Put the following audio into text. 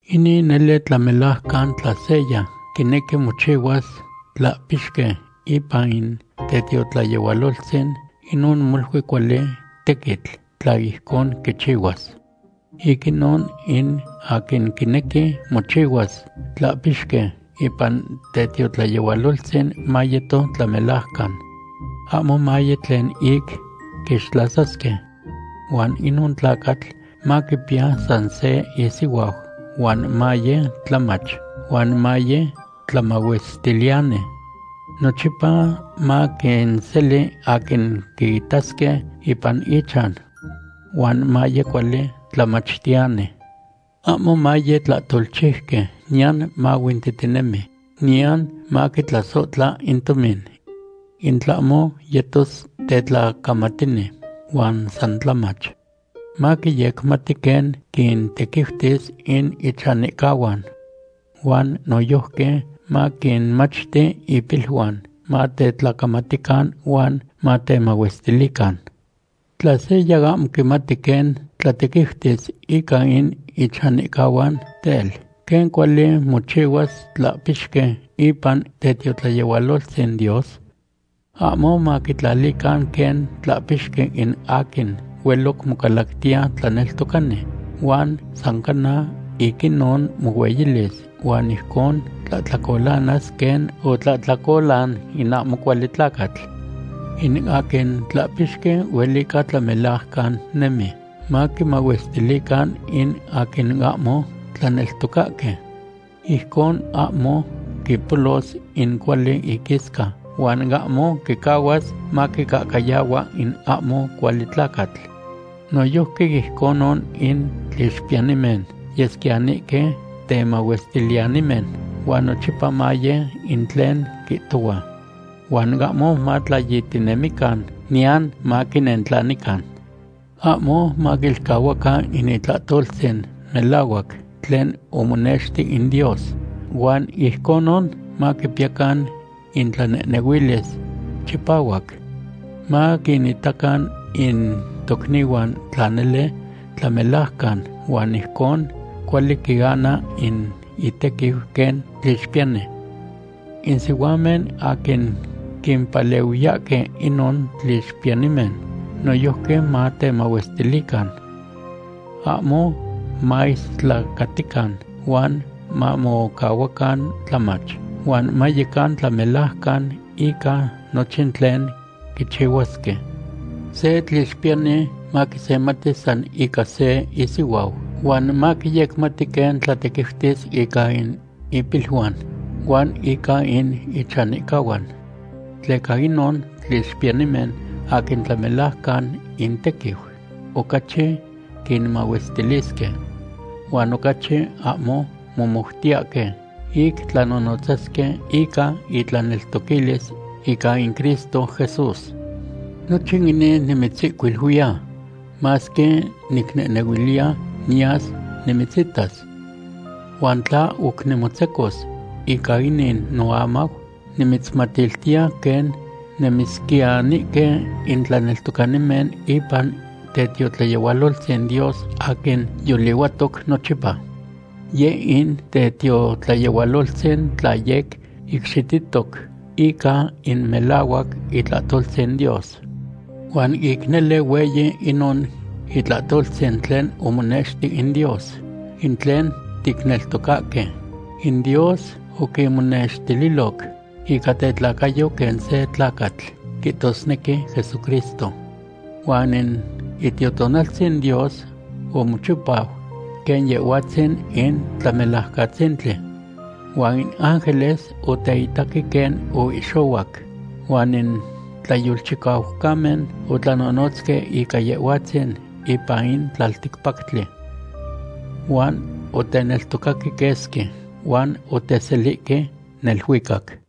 Inin nele tlamelajcan; tla seya quinequi mochihuas tlahpixqui ipan in tetiotlayehualoltzin, inon molui cuali tequitl tla ijcon quichihuas. Ic inon, in aquin quinequi mochihuas tlahpixqui ipan tetiotlayehualoltzin mayeto tlamelajcan. Ahmo maye tlen ic quixtlasasque. Huan inon tlacatl maquipiya san se isihuau huan maye tlamach huan maye tlamahuestiliyani. Nochipa maquinseli aquin quiitasque ipan ichan. Huan maye cuali tlamachtiyani. Ahmo maye tlahtolchiuqui niyan mahuintihtinemi, niyan maquitlasohtla in tomin. In tlahmo yetos tetlacamatini, huan san tlamach. Maquiyecmati quen quintequiutis in ichanihcahuan. Huan noyojqui maquinmachti ipiluan matetlacamatican huan matlamahuestilican. Tla seya ahmo quimati quen tlatequiutis ica in ichanihcahuan, tel, ¿quen cuali mochihuas tlahpixqui ipan tetiotlayehualoltzin Dios? Ahmo maquitlalican quen tlahpixqui in aquin hueloc mocalactiya tlaneltocani, huan san cana ic inon mohueyilis huan ijcon tlahtlacolanas quen otlahtlacolan in ahmo cuali tlacatl. In aquin tlahpixqui huelica tlamelajcan nemi, maquimahuestilican in aquin ahmo tlaneltocahque. Ijcon ahmo quipolos in cuali iquisca huan ahmo quicahuas maquicahcayahua in ahmo cuali tlacatl. Noyojqui ijconon, in tlixpiyanimen yesquiyanihque temahuestiliyanimen huan nochipa maye in tlen quihtohua. Huan ahmo matlayihtinemican, niyan san maquinentlanican. Ahmo maquilcahuacan in itlahtoltzin melahuac tlen omonexti in Dios huan ijconon maquipiyacan intlanehnehuilis chipahuac. Maquinitacan in tocnihuan tla nele tlamelajcan huan ijcon cuali quiana in itequiu quen tlixpiyani. In sihuamen aquin quimpalehuiyahque inon tlixpiyanimen noyojqui matemahuestilican. Ahmo maistlacatican, huan mamocahuacan tlamach, huan mayecan tlamelajcan ica nochin tlen quichihuasque. Se tlixpiyani maquisemati san ica se isihuau huan maquiyecmati quen tlatequiutis ica in ipiluan huan ica in ichanihcahuan. Tleca inon tlixpiyanimen aquin tlamelajcan intequiu ocachi quinmahuestilisque huan ocachi ahmo momoutiyahque ic tlanonotzasque ica intlaneltoquilis ica in Cristo Jesús. Nochin inin nimitzihcuiluiya, masque nicnehnehuiliya niyas nimitzitas. Huan tla oc nimotzecos, ica inin noamau nimitzmatiltiya quen nemisquiyanihque in tlaneltocanimen ipan tetiotlayehualoltzin Dios aquin yolihuatoc nochipa. Yeh in tetiotlayehualoltzin tlen yec icxitihtoc ica in melahuac itlahtoltzin Dios. Huan ic nele, hueyi inon itlahtoltzin tlen omonexti in Dios, in tlen ticneltocahque: In Dios oquinmonextililoc ica tetlacayo quen se tlacatl, quihtosnequi Jesucristo. Huan in Itiotonaltzin Dios omochipau quen Yehhuatzin in Tlamelajcatzintli. Huan in ángeles oteitaque quen oihxohuac. Huan in tlayolchicaucamen otlanonotzque ica Yehhuatzin ipan in tlalticpactli. Huan oteneltocaque quesqui, huan oteselihque neluicac.